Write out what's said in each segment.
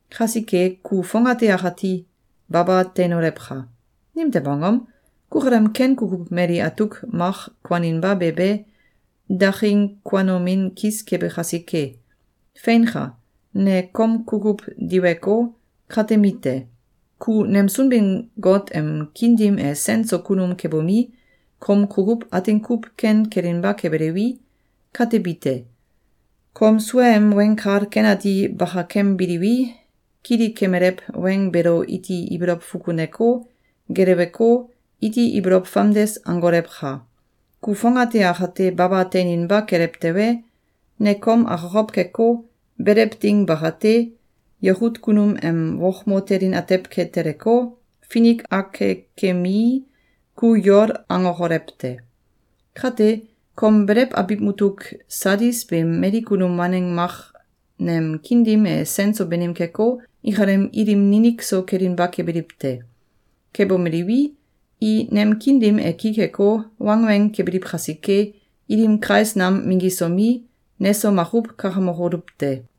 Kasike, ku fongate akati baba teinolewka! Nimtew angom? Kukalem ken kukuw mali atuk mak kuaninba be be, daking kuanomin kis kebe kasike. Feinka! Ne kom kukuw diweko, katemi te. Ku nem Sunbin-Got em kiin dim e sen so kunum kebomi, kom kukuw atin kuw ken kelinba kebelewi, katebi te. Kom suaem Weng Kal Ken Ati bakakembiliwi, kilikemelew weng beelo iti ibolow fukuneko, geleweko, iti ibolow famdes angolewka! Ku fongate akate baba teininba kelew tewe, ne kom akokow keko, belew ding bakate, yakut kunum em wokmo telin atew ke teleko, finik akekemii, ku yol angokolew te. Kate, kom belew abiw mutuk Sadis beem mali kunum waneng mak nem kiin dim e sen so banim keko, ikalem ilim ninik so kelinba kebiliw te. Kebomeliwi, i nem kiin dim e ki keko, wangweng kebiliw kasike, ilim kais nam minggisomi, neso makuw kakamokoluw te.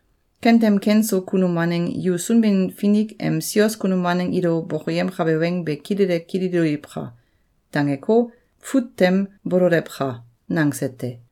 Kentem ken so kunum waneng yu Sunbin-Finik em sios kunum waneng ilo bokoyemkabe weng be kilele kililoliwka!’, dangeko, fut tem bololewka!”, nangse te.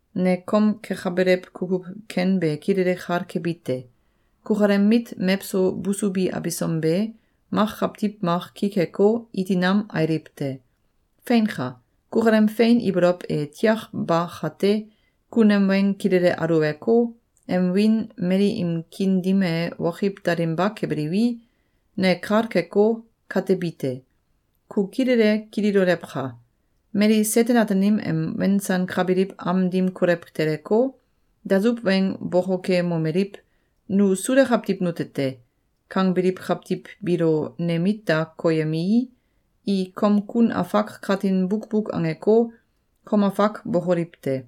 ‘Ne kom kekabelew kukuw ken be kilele kal kebi te. Kukalem mit mewso busubi abisom be, mak kawtiw mak ki keko, iti nam ailiw te. Feinka! Kukalem fein ibolow e tiak ba kate, ku nem weng kilele aluweko, nem wiin mali im kiin dim e wokiw dalinba kebelewi, ne kal keko, katebi te. Ku kilele kililolewka! Mali Seten-Ataanim em wensankabiliw am dim kolew teleko, dasuw weng bokokemomeliw: ‘Nu Suda kawtiw nute te!’, kangbiliw kawtiw biilo ne mit da koyemii, i kom kun afak katin bukbuk angeko, kom afak bokoliw te.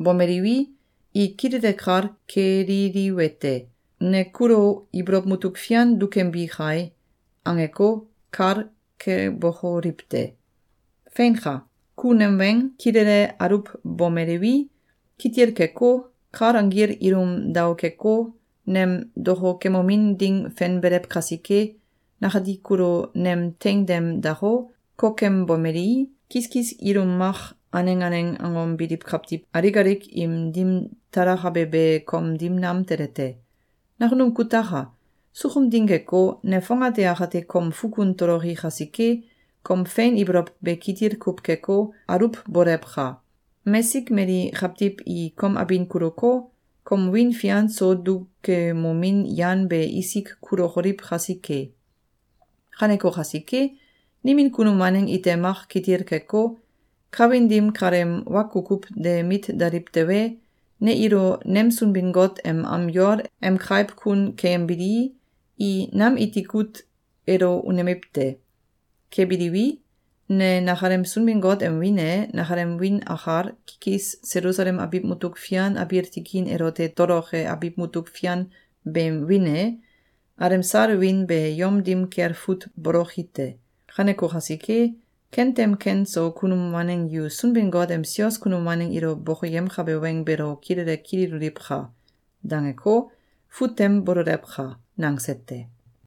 Bomeliwi, i kilele kal keliliwete: ‘Ne kulo ibolow mutuk fian dukembi kai.’, angeko, kal kebokoliw te. Feinka! Ku nem weng kilele aluwbomelewi, kitil keko, kal anggil ilum daokeko, nem dokokemomin ding fenbelew kasike, nakati kulo nem teing tem dako, kokembomelii, kiskis ilum mak aneng aneng angom biliw kawtiw alik alik im dim talakabe be kom dim nam tele te. Nakunum kutaka! Sukum ding keko, ne fongate akate kom fukun toloki kasike, kom fein ibolow be kitil kuw keko, aluwbolewka! Mesik mali kawtiw i kom abin kuluko, kom wiin fian so dukemomin yan be isik kulokoliw kasike. Kaneko kasike, nimin kunum waneng ite mak kitil keko, kawin dim kaleem wa kukuw de mit daliw tewe, ne ilo nem Sunbin-Got em am yol em kaiw kun keyembilii, i nam iti kut elo unemiw te. Kebiliwi, ne nakalem Sunbin-Got em wiin e, nakalem wiin akal, kikis Selusalem abiw mutuk fian abiil tikin elote toloke abiw mutuk fian beem wiin e, alemsal wiin be yom dim kel fut boloki te. Kaneko kasike, kentem ken so kunum waneng yu Sunbin-Finik em sios kunum waneng ilo bokoyemkabe weng beelo kilele kililoliwka!’, dangeko, fut tem bololewka!”, nangse te.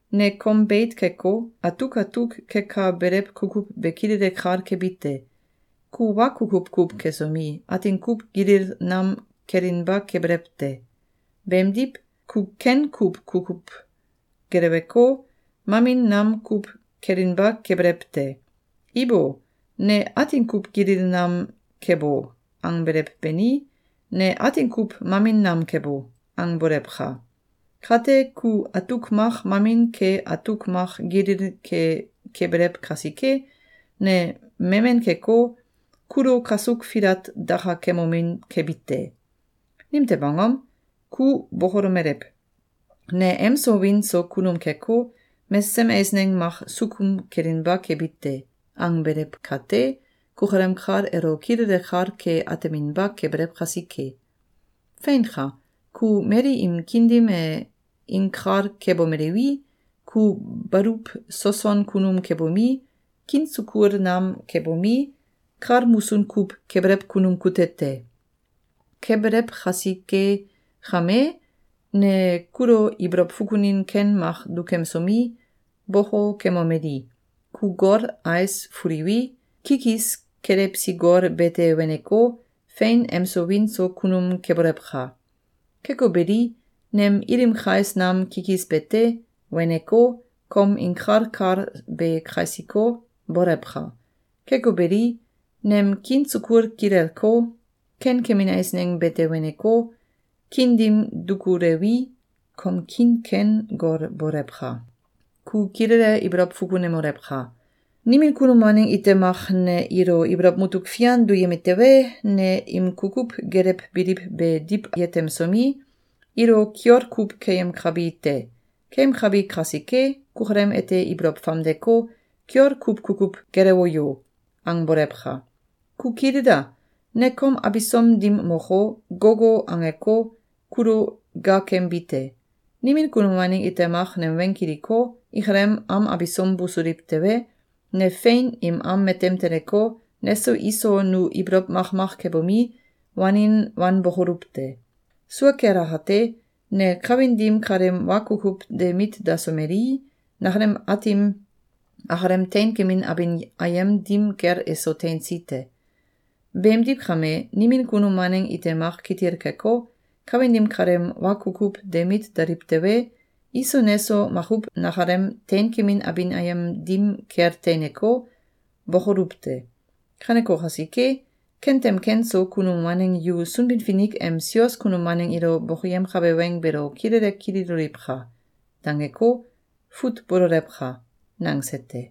‘Ne kom beit keko, atuk atuk kekabelew kukuw be kilele kal kebi te. Ku wa kukuw kuw kesomi, atin kuw gilil nam kelinba kebelew te. Beemdiw, ku ken kuw kukuw geleweko, mamin nam kuw kelinba kebelew te. Ibo! ‘Ne atin kuw gilil nam kebo!’, angbelew beni, ‘Ne atin kuw mamin nam kebo!’, angbolewka! Kate, ku atuk mak mamin ke atuk mak gilil ke kebelew kasike, ne memen keko, kulo kasuk filat dakakemomin kebi te. Nimtew angom? Ku bokolomelew: ‘Ne emso wiin so kunum keko, mesesem eisneng mak sukum kelinba kebi te!’, angbelew kate, kukalem kal elo kilele kal ke ateminba kebelew kasike. Feinka! Ku mali im kiin dim e inkal kebomelewi, ku baluw soson kunum kebomi, kiin sukul nam kebomi, kal musun kuw kebelew kunum kute te. Kebelew kasike kame, ne kulo ibolow fukunin ken mak dukemsomi, bokokemomeli: ‘Ku gol ais fuliwi, kikis kelewsi gol bete weneko, fein emso wiin so kunum kebolewka! Keko beli, nem ilim kais nam kikis bete weneko, kom inkal kal be kasiko, bolewka! Keko beli, nem kiin sukul kilelko, ken kemin eisneng bete weneko, kiin dim dukulewi, kom kiin ken gol bolewka! Ku kilele ibolow fukunemolewka! Nimin kunum waneng ite mak ne ilo ibolow mutuk fian duyemi tewe, ne im kukuw gelewbiliw be diw yetemsomi, ilo kiol kuw keyemkabi te. Keyemkabi kasike, kukalem ete ibolow famdeko, ‘Kiol kuw kukuw gelewo yo!’, angbolewka! Ku kilila! Ne kom abisom dim moko, gogo angeko, kulo gaakembi te. Nimin kunum waneng ite mak nem weng kiliko, ikalem am abisom busuliw tewe, ne fein im am matem teleko, neso iso nu ibolow makmak kebomi, wanin wanbokoluw te. Sua kel akate, ne kawin dim kaleem wa kukuw de mit dasomelii, nakalem Aatim akalem teinkemin abin ayem dim kel eso teinsi te. Beemdiw kame, nimin kunum waneng ite mak kitil keko, kawin dim kaleem wa kukuw de mit daliw tewe, iso neso makuw nakalem teinkemin abin ayem dim kel teineko, bokoluw te. Kaneko kasike, kentem ken so kunum waneng yu Sunbin-Finik em sios kunum waneng ilo bokoyemkabe weng beelo kilele kililoliwka!’, dangeko, fut bololewka!”, nangse te.